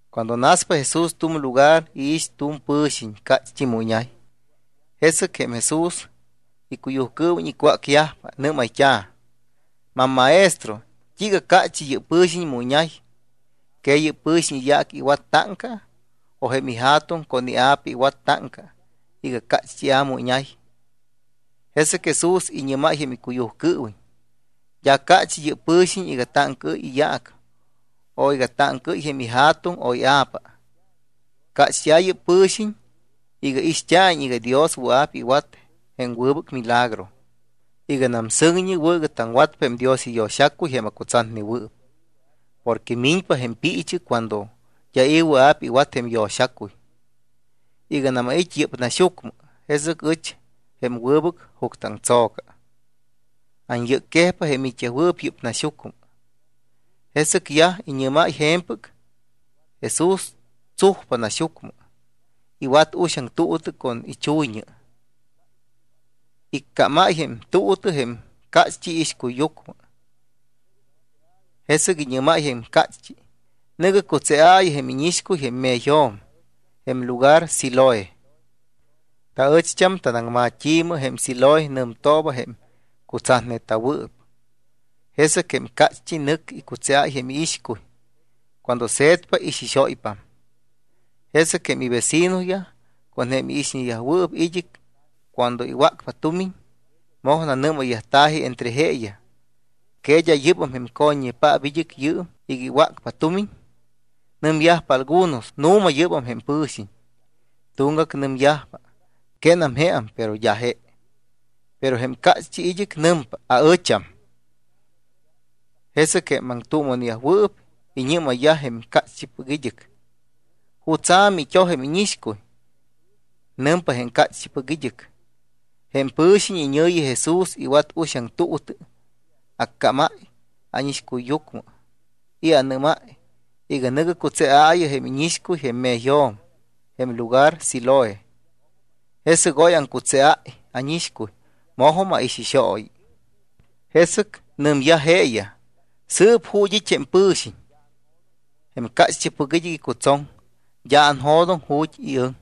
Cuando naspa Jesús tu̱m lugar, iix tu̱m pɨ̱xiñ, cácht́i mu iñay. Jesɨc jém Jesús icuyujcɨɨwiñ icwácyajpa. Nɨ́mayt́a̱: —MamMaestro, ¿t́iiga cácht́i yɨ́p pɨ̱xiñ mu iñay? ¿Que yɨ́p pɨ̱xiñ iyaac iwat táŋca, o jém ija̱tuŋ con ia̱pa iwat táŋca iga cácht́ia̱ mu iñay? Jesɨc Jesús iñɨ́máy jém icuyujcɨɨwiñ: —D́a cácht́i yɨ́p pɨ̱xiñ iga táŋcaɨ́y iyaac o iga táŋcaɨ́y jém ija̱tuŋ o ia̱pa. Cácht́ia̱ yɨ́p pɨ̱xiñ iga ixt́a̱iñ iga Dios wɨa̱p iwat jém wɨbɨc milagro. Iganam sɨŋñi wɨ̱ iga taŋwatpa jém Dios iyo̱xacuy jém acutsatnewɨɨp, porque miñpa jém piichɨ cuando d́a i̱ wɨa̱p iwat jém yo̱xacuy. Iganam ait́ yɨ́p naxyucmɨ, jesɨc ɨch jém wɨbɨc juctɨaŋtso̱ca, anyɨcquejpa jém it́yajwɨɨp yɨ́p naxyucmɨ. Jesɨc yaj iñɨ́máy je̱mpɨc, Jesús tsujpa naxyucmɨ, iwat uxaŋ tuutɨ con ichuyñɨ, iccámáy jém tuutɨ jém cácht́i iixcuyyucmɨ. Jesɨc iñɨ́máy jém cácht́i: —Nɨ̱gɨ cutseaayɨ jém íñixcuy jém me̱yjo̱m jém lugar Siloé. Taɨcht́am tanaŋmat́i̱mɨ jém Siloé nɨmtooba jém cutsatneta̱wɨɨp. Jesɨc jém cácht́i nɨcpa icutseáy jém iixcuy. Cuando se̱tpa, ixixóypam. Jesɨc jém ivecinoyaj con jém iixñeyajwɨɨp id́ɨc cuando iwácpa tumiñ, moj nanɨ́mayyajta̱ji entre jeeyaj: —¿Que d́a yɨ́bam jém co̱ññepaap id́ɨc yɨɨm iga iwácpa tumiñ? Nɨmyajpa algunos: —Nu̱ma, yɨ́bam jém pɨ̱xiñ. Tuŋgac nɨmyajpa: —Quénam jeam, pero d́a je. Pero jém cácht́ipɨc id́ɨc nɨmpa: —Aɨcham. Jesɨc jém aŋtuuma̱neyajwɨɨp iñɨ́mayyaj jém cácht́ipɨc id́ɨc: —¿Jutsa̱ mit́oj jém íñixcuy? Nɨmpa jém cácht́ipɨc id́ɨc: —Jém pɨ̱xiñ iñɨ̱yi Jesús iwat uxaŋ tuutɨ, accámáy ánixcuyyucmɨ y anɨ́máy iga: “Nɨ̱gɨ cutseaayɨ jém íñixcuy jém me̱yjo̱m jém lugar Siloé.” Jesɨc oy aŋcutseáy ánixcuy, mojum aixixooyi. Jesɨc nɨmyaj jeeyaj: —¿Sɨɨp ju̱t́ it́ jém pɨ̱xiñ? Jém cácht́ipɨc id́ɨc icutsoŋ: —D́a anjo̱doŋ ju̱t́ iɨŋ.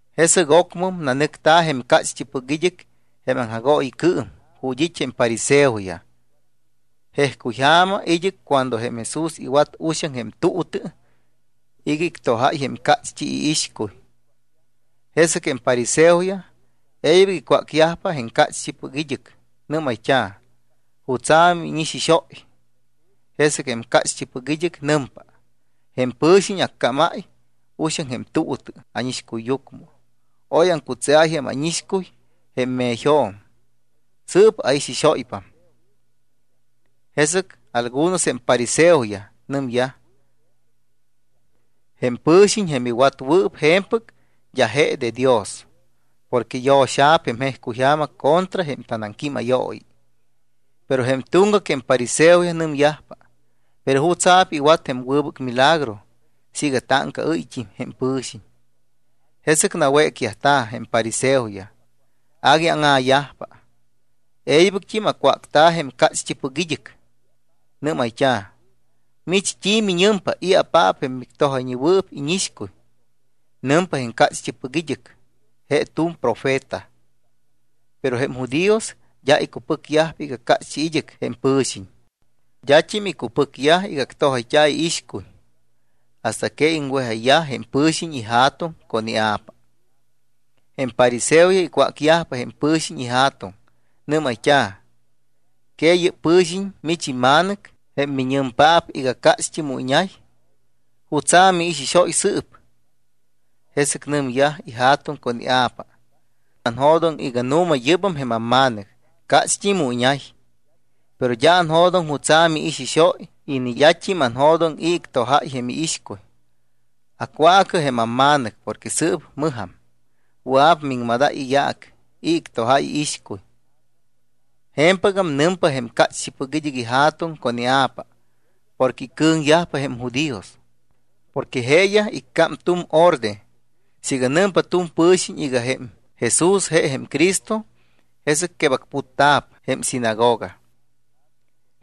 Jesɨc ocmɨm nanɨcta̱ jém cácht́ipɨc id́ɨc jém aŋjagooyicɨɨm ju̱t́ it́ jém fariseoyaj. Jejcuyja̱ma id́ɨc cuando jém Jesús iwat uxaŋ jém tuutɨ iga ictojáy jém cácht́i iixcuy. Jesɨc jém fariseoyaj e̱ybɨc icwácyaj jém cácht́ipɨc id́ɨc. Nɨ́mayt́a̱: —¿Jutsa̱ miixixóy? Jesɨc jém cácht́ipɨc id́ɨc nɨmpa: —Jém pɨ̱xiñ accámáy uxaŋ jém tuutɨ ánixcuyyucmɨ. Oy aŋcutseáy jém ánixcuy jém me̱yjo̱m. Sɨɨp aixixóypam. Jesɨc algunos jém fariseoyaj nɨmyaj: —Jém pɨ̱xiñ, jém iwatnewɨɨp je̱mpɨc, d́a je de Dios porque yo̱xa̱p jém jejcuyja̱ma contra jém tanaŋquímayooyi. Pero jém tuŋgac jém fariseoyaj nɨmyajpa: —¿Pero jutsa̱p iwat jém wɨbɨc milagro siiga táŋcaɨ́yt́im jém pɨ̱xiñ? Jesɨc nawécyajta̱ jém fariseoyaj. Agui áŋa̱yajpa. E̱ybɨct́im acwácta̱ jém cácht́ipɨc id́ɨc. Nɨ́mayt́a̱: —¿Mich t́i miñɨmpa, i̱apaap jém mictojayñewɨɨp íñixcuy? Nɨmpa jém cácht́ipɨc id́ɨc: —Je tu̱m profeta. Pero jém judíos d́a icupɨcyajpa iga cácht́i id́ɨc jém pɨ̱xiñ. D́at́im icupɨcyajpa iga actojayt́a̱ iixcuy hasta que iŋwejáyayyaj jém pɨ̱xiñ ija̱tuŋ con ia̱pa. Jém fariseoyaj icwácyajpa jém pɨ̱xiñ ija̱tuŋ. Nɨ́mayt́a̱: —¿Que yɨ́p pɨ̱xiñ mich imma̱nɨc, jém miñɨmpaap iga cácht́i mu iñay? ¿Jutsa̱p miixixóy sɨɨp? Jesɨc nɨmyaj ija̱tuŋ con ia̱pa: —Anjo̱doŋ iga nu̱ma yɨ́bam jém amma̱nɨc, cácht́i miñay. Pero d́a anjo̱doŋ jutsa̱ miixixóy y ni d́at́im anjo̱doŋ i̱ ictojáy jém iixcuy. Acwaacɨ jém amma̱nɨc porque sɨɨp mɨjam, wɨa̱p miŋmadáy iyaac i̱ ictojáy iixcuy. Je̱mpɨgam nɨmpa jém cácht́ipɨc id́ɨc ija̱tuŋ con ia̱pa porque icɨ̱ŋyajpa jém judíos. Porque jeeyaj iccám tu̱m orde siiga nɨmpa tu̱m pɨ̱xiñ iga jém Jesús je jém Cristo, jesɨc quebacputta̱p jém sinagoga.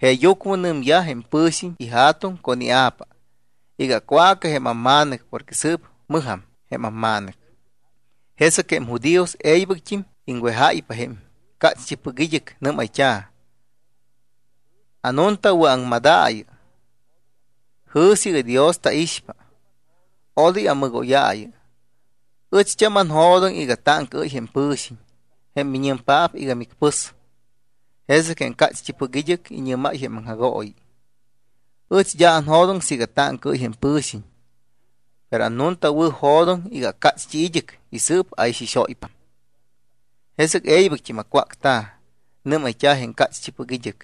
Jeeyucmɨ nɨmyaj jém pɨ̱xiñ ija̱tuŋ con ia̱pa iga: “Acwaacɨ jém amma̱nɨc porque sɨɨp mɨjam jém amma̱nɨc.” Jesɨc jém judíos e̱ybɨct́im iŋwejáypa jém cácht́ipɨc id́ɨc. Nɨ́mayt́a̱: —Anuntawɨ̱aŋmadaayɨ. Jɨ̱sɨ iga Dios taixpa. Odoy amɨgóyaayɨ. Ɨcht́am anjo̱doŋ iga táŋcaɨ́y jém pɨ̱xiñ jém miñɨmpaap iga micpɨs. Jesɨc jém cácht́ipɨc id́ɨc iñɨ́máy jém aŋjagooyi: —Ɨch d́a anjo̱doŋ siiga táŋcaɨ́y jém pɨ̱xiñ. Pero annuntawɨ̱jo̱doŋ iga acácht́i id́ɨc y sɨɨp aixixóypam. Jesɨc e̱ybɨct́im acwácta̱. Nɨ́mayt́a̱ jém cácht́ipɨc id́ɨc: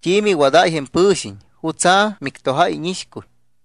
—¿T́i miwadáy jém pɨ̱xiñ? ¿Jutsa̱ mictojáy jém íñixcuy?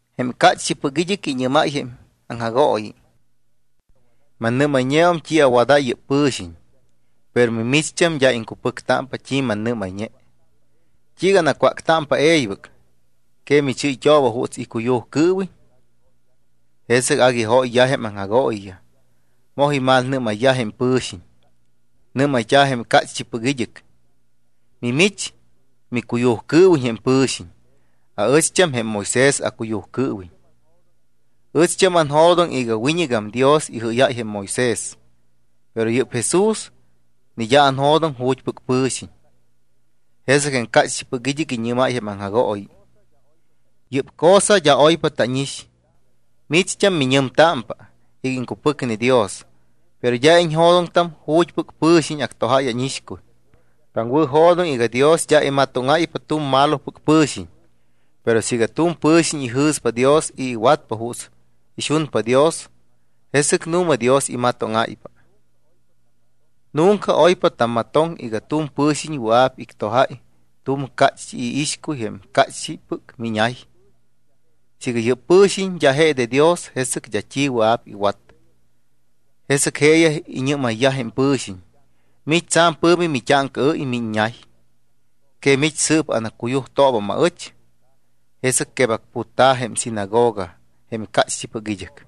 Jém cácht́ipɨc id́ɨc iñɨ́máy jém aŋjagooyi: —Mannɨ́mayñeum t́i awadáy jém pɨ̱xiñ, pero mimicht́am d́a iŋcupɨctámpa t́i mannɨ́mayñe. ¿T́iiga anacwáctámpa e̱ybɨc? ¿Que michɨ́yt́ooba juuts icuyujcɨɨwiñ? Jesɨc agui jóyyaj jém aŋjagooyiyaj. Moj imalmalnɨ́mayyaj jém pɨ̱xiñ. Nɨ́mayt́a̱ jém cácht́ipɨc id́ɨc: —Mimich micuyujcɨɨwiñ jém pɨ̱xiñ. Aɨcht́am jém Moisés acuyujcɨɨwiñ. Ɨcht́am anjo̱doŋ iga wiñɨgam Dios ijɨ́yáy jém Moisés, pero yɨ́p Jesús ni d́a anjo̱doŋ ju̱t́pɨc pɨ̱xiñ. Jesɨc jém cácht́ipɨc id́ɨc iñɨ́máy jém aŋjagooyi: —Yɨ́p cosa d́a oypa tánix. Mimicht́am miñɨmtámpa iga iŋcupɨcne Dios, pero d́a iñjo̱doŋtam ju̱t́pɨc pɨ̱xiñ actojáy ánixcuy. Taŋwɨ̱jo̱doŋ iga Dios d́a imatóŋáypa tu̱m malopɨc pɨ̱xiñ. Pero siiga tu̱m pɨ̱xiñ ijɨ̱spa Dios y iwatpa juuts ixunpa Dios, jesɨc nu̱ma Dios imatóŋáypa. Nunca oypa tammatoŋ iga tu̱m pɨ̱xiñ wɨa̱p ictojáy tu̱m cácht́i iixcuy jém cácht́ipɨc miñay. Siiga yɨ́p pɨ̱xiñ d́a je de Dios, jesɨc d́a t́i wɨa̱p iwat. Jesɨc jeeyaj iñɨ́mayyaj jém pɨ̱xiñ: —Mich tsa̱m pɨ̱mi mit́áŋcaɨ́y miiññay. ¿Que mich sɨɨp anaccuyujtoobam aɨch? Jesɨc quebacputta̱ jém sinagoga jém cácht́ipɨc id́ɨc.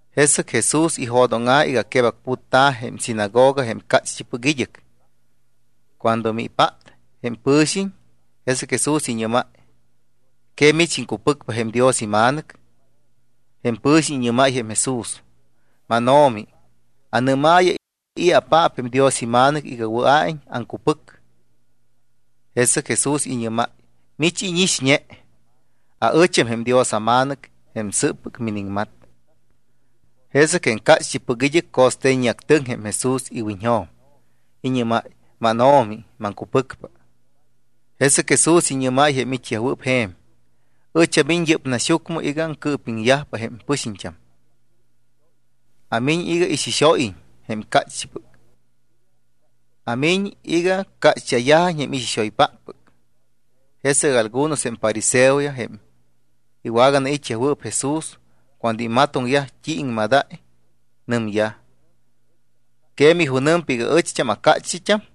Jesɨc Jesús ijo̱dóŋa̱ iga quebacputta̱ jém sinagoga jém cácht́ipɨc id́ɨc. Cuando mipát jém pɨ̱xiñ, jesɨc Jesús iñɨ́máy: —¿Que mich iŋcupɨcpa jém Dios iMa̱nɨc? Jém pɨ̱xiñ iñɨ́máy jém Jesús: —MánO̱mi, anɨ́maayɨ: ¿I̱apaap jém Dios iMa̱nɨc iga wɨa̱iñ aŋcupɨc? Jesɨc Jesús iñɨ́máy: —Mich íñixñe. Aɨcham jém Dios aMa̱nɨc jém sɨɨppɨc miniŋmat. Jesɨc jém cácht́ipɨc id́ɨc co̱ste̱ññeactɨŋ jém Jesús iwiñjo̱m. Iñɨ́máy: —MánO̱mi, maŋcupɨcpa. Jesɨc Jesús iñɨ́máy jém it́yajwɨɨp je̱m: —Ɨch amiñ yɨ́p naxyucmɨ iga aŋcɨɨpiŋyajpa jém pɨxiñt́am. Amiñ iga ixixóyiñ jém cácht́ipɨc, amiñ iga cácht́ia̱yajiñ jém ixixoypáppɨc. Jesɨc algunos jém fariseoyaj jém iwaganait́yajwɨɨp Jesús, cuando imatoŋyaj t́i iŋmadáy, nɨmyaj: —¿Que mijunɨmpa iga aɨcham acácht́it́am?